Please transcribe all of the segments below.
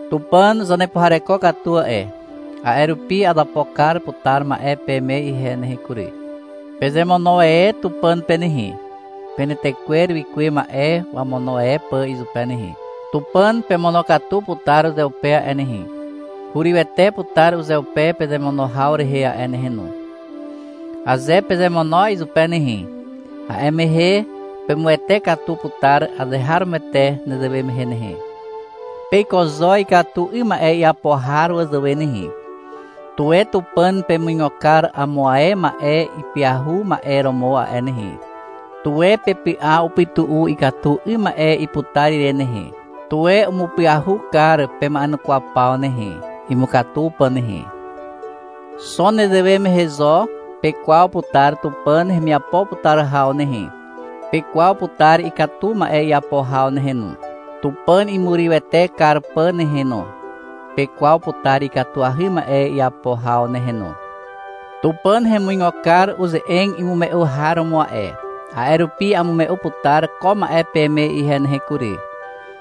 Tupàn zanepuhareko katu a'e. A'e rupi azapo kar putar ma'e peme ihe nehe kury. Pezemono e Tupàn pe nehe, penetekwer wikuwe ma'e wamono e pà izupe nehe. Tupàn pemonokatu putar uzeupe a'e nehe. Hurywete putar uzeupe pezemono haw rehe a'e nehe no. Aze pezemono izupe nehe, a'e mehe pemuwete katu putar azeharomoete nezewe mehe nehe. Peiko zo ikatu 'ym ma'e iapo har wazàwe nehe. Tuwe Tupàn pemuigo kar amo ae ma'e ipyahu ma'e romo a'e nehe. Tuwe pepy'a upytu'u ikatu 'ym ma'e iputar ire nehe. Tuwe umupyahu kar pema'enukwaw paw nehe, imukatu pà nehe. Xo nezewe mehe zo pekwaw putar Tupàn hemiapo putar haw nehe. Pekwaw putar ikatu ma'e iapo haw nehe no, Tupàn imurywete kar pà nehe no. Pekwaw putar ikatuahy ma'e iapo haw nehe no. Tupàn hemuigo kar uze'eg imume'u har romo a'e. A'e rupi amume'u putar ko ma'e peme ihe nehe kury.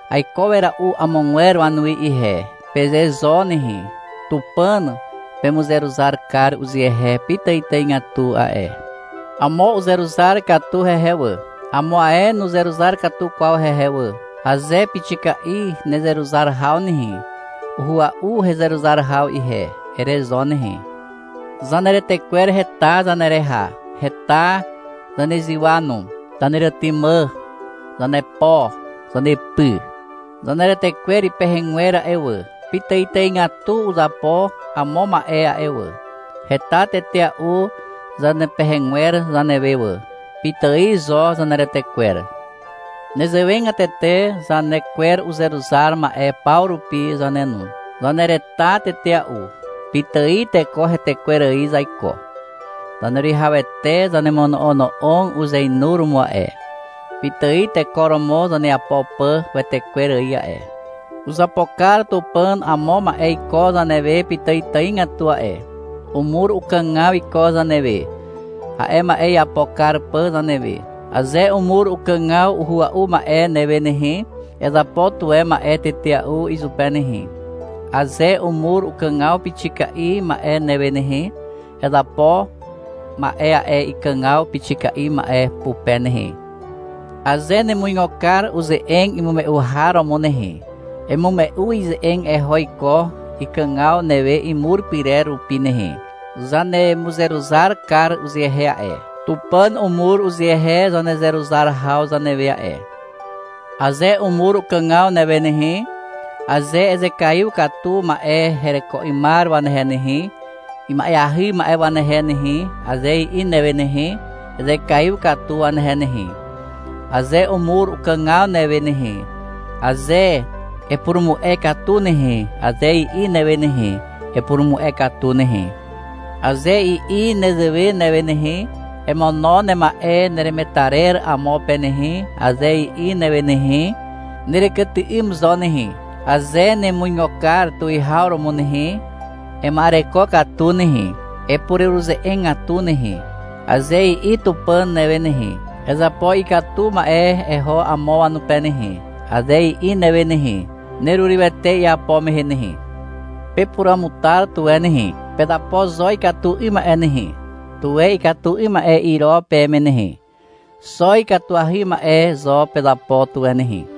— Aiko wera'u amogwer wanuwi ihe, peze zo nehe. Tupàn pemuzeruzar kar uzehe pitàitàigatu a'e. Amo uzeruzar katu hehe wà, amo ae nuzeruzar katu kwaw hehe wà. Aze pixika'i nezeruzar haw nehe, — Uhua'u hezeruzar haw ihe, ere zo nehe. Zaneretekwer heta zanereha, heta zanezywa no. Zaneretymà, zanepo, zanepy. Zaneretekwer ipehegwer a'e wà, pitàitàigatu uzapo amo ma'e a'e wà. Heta tetea'u zanepehegwer zanewe wà. Pitài zo zaneretekwer. Nezewegatete zane kwer uzeruzar ma'e paw rupi zane no. Zanereta tetea'u. Pitài teko hetekwer ài zaiko. Zaneruwihawete zanemono'ono'og uzeinuromo a'e, pitài teko romo zaneapo pà wetekwer ài a'e. Uzapo kar Tupàn amo ma'e iko zanewe pitàitàigatu a'e. Umur ukàgaw iko zanewe, a'e ma'e iapo kar pà zanewe. Aze umur ukàgaw uhua'u ma'e newe nehe, ezapo tuwe ma'e tetea'u izupe nehe. Aze umur ukàgaw pixika'i ma'e newe nehe, ezapo ma'e a'e ikàgaw pixika'i ma'e pupe nehe. Aze nemuigo kar uze'eg imume'u har romo nehe, emume'u ize'eg eho iko ikàgaw newe imur pyrer rupi nehe. Zanemuzeruzar kar uzehe a'e. Tupàn umur uzehe zanezeruzar haw zanewe a'e. Aze umur ukàgaw newe nehe, aze — Ezekaiw katu ma'e hereko 'ymar wanehe nehe, ima'eahy ma'e wanehe nehe, aze i'i newe nehe, ezekaiw katu wanehe nehe. Aze umur ukàgaw newe nehe, aze — Epurumu'e katu nehe, aze i'i newe nehe, epurumu'e katu nehe. Aze i'i nezewe newe nehe, — Emono nema'e neremetarer amo pe nehe, aze i'i newe nehe, nerekyty'ym zo nehe. Aze nemuigo kar tuwihaw romo nehe, ema'ereko katu nehe, epureruze'egatu nehe. Aze i'i Tupàn newe nehe, — Ezapo ikatu ma'e eho amo wanupe nehe, aze i'i newe nehe, nerurywete iapo mehe nehe. Pepuruamutar tuwe nehe. Pezapo zo ikatu 'ym ma'e nehe. Tuwe ikatu 'ym ma'e iro peme nehe. Xo ikatuahy ma'e zo pezapo tuwe nehe.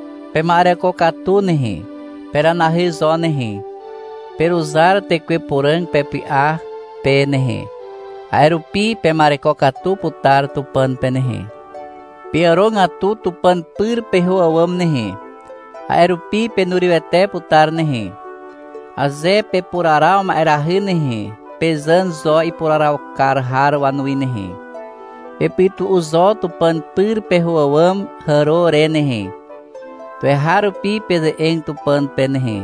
Pema'ereko katu nehe. Peranahy zo nehe. Peruzar Tekwe Puràg pepy'a pe nehe, a'e rupi pema'ereko katu putar Tupàn pe nehe. Peàrogatu Tupàn pyr peho àwàm nehe. A'e rupi penurywete putar nehe. Aze pepuraraw ma'erahy nehe, pezàn zo ipuraraw kar har wanuwi nehe. Pepytu'u zo Tupàn pyr peho àwàm hàro re nehe. Tuweharupi peze'eg Tupàn pe nehe.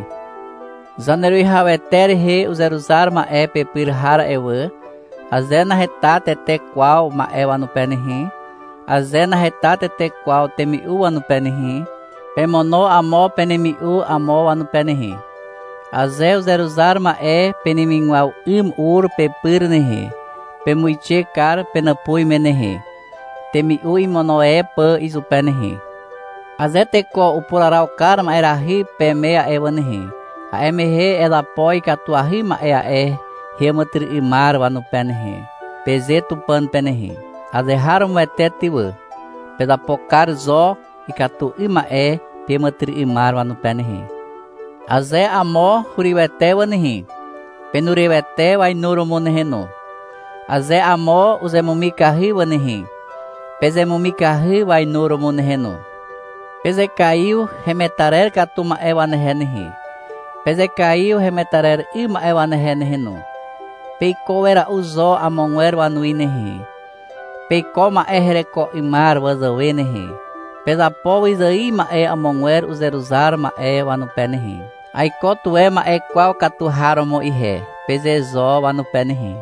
Zaneruwihawete rehe uzeruzar ma'e pepyr har a'e wà, aze naheta tete kwaw ma'e wanupe nehe, aze naheta tete kwaw temi'u wanupe nehe, pemono amo penemi'u amo wanupe nehe. Aze uzeruzar ma'e penemigwaw 'ym ur pepyr nehe, pemuixe kar penàpuz me nehe, temi'u imono e pà izupe nehe. Aze teko upuraraw kar ma'erahy peme a'e wà nehe, a'e mehe — Ezapo ikatuahy ma'e a'e heàmàtyry'ymar wanupe nehe, peze Tupàn pe nehe. Azeharomoete ty wà. Pezapo kar zo ikatu 'ym ma'e peàmàtyry'ymar wanupe nehe. Aze amo hurywete wà nehe, penurywete wainuromo nehe no. Aze amo uzemumikahy wà nehe, pezemumikahy wainuromo nehe no. Pezekaiw hemetarer katu ma'e wanehe nehe. Pezekaiw hemetarer 'ym ma'e wanehe nehe no. Peiko wera'u zo amogwer wanuwi nehe. Peiko ma'e hereko 'ymar wazàwe nehe. Pezapo wyzài ma'e amogwer uzeruzar ma'e wanupe nehe. — Aiko tuwe ma'e kwaw katu har romo ihe, peze zo wanupe nehe.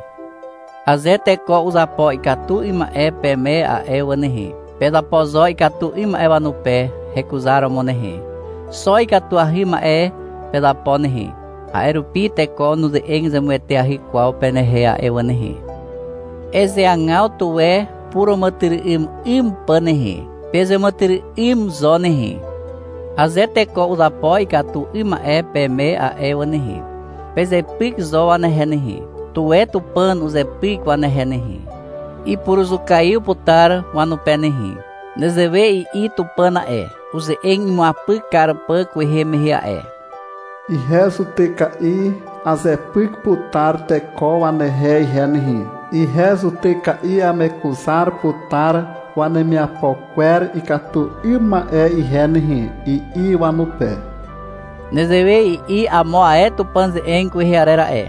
Aze teko uzapo ikatu 'ym ma'e peme a'e wà nehe, pezapo zo ikatu 'ym ma'e wanupe hekuzaromo nehe. Xo ikatuahy ma'e pezapo nehe. A'e rupi teko nuze'eg zemueteahy kwaw penehe a'e wà nehe. Ezeagaw tuwe puràmàtyry'ym 'ym pà nehe. Pezeàmàtyry'ym zo nehe. Aze teko uzapo ikatu 'ym ma'e peme a'e wà nehe, pezepyk zo wanehe nehe. Tuwe Tupàn uzepyk wanehe nehe. Ipuruzukaiw putar wanupe nehe. Nezewe i'i Tupàn a'e, uze'eg imuapyk kar pà kwehe mehe a'e. — Ihe zutyka'i azepyk putar teko wanehe ihe nehe, ihe zutyka'i amekuzar putar wanemiapo kwer ikatu 'ym ma'e ihe nehe, i'i wanupe. Nezewe i'i amo ae Tupàn ze'eg kwehe arer a'e.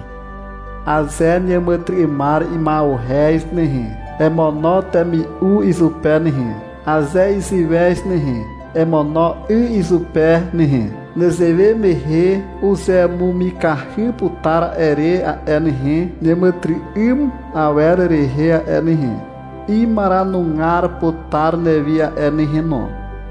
— Aze neàmàtyry'ymar ima'uhez nehe, emono temi'u izupe nehe. Aze iziwez nehe, emono 'y izupe nehe. Nezewe mehe uzemumikahy putar a'e re a'e nehe, neàmàtyry'ym awer rehe a'e nehe. Imaranugar putar newi a'e nehe no.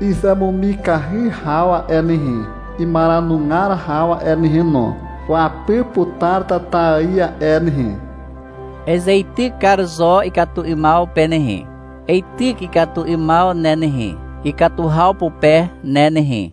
Izemumikahy haw a'e nehe, imaranugar haw a'e nehe no, wapy putar tata ài a'e nehe. Ezeityk kar zo ikatu 'ymaw pe nehe. Eityk ikatu 'ymaw ne nehe, ikatu haw pupe ne nehe.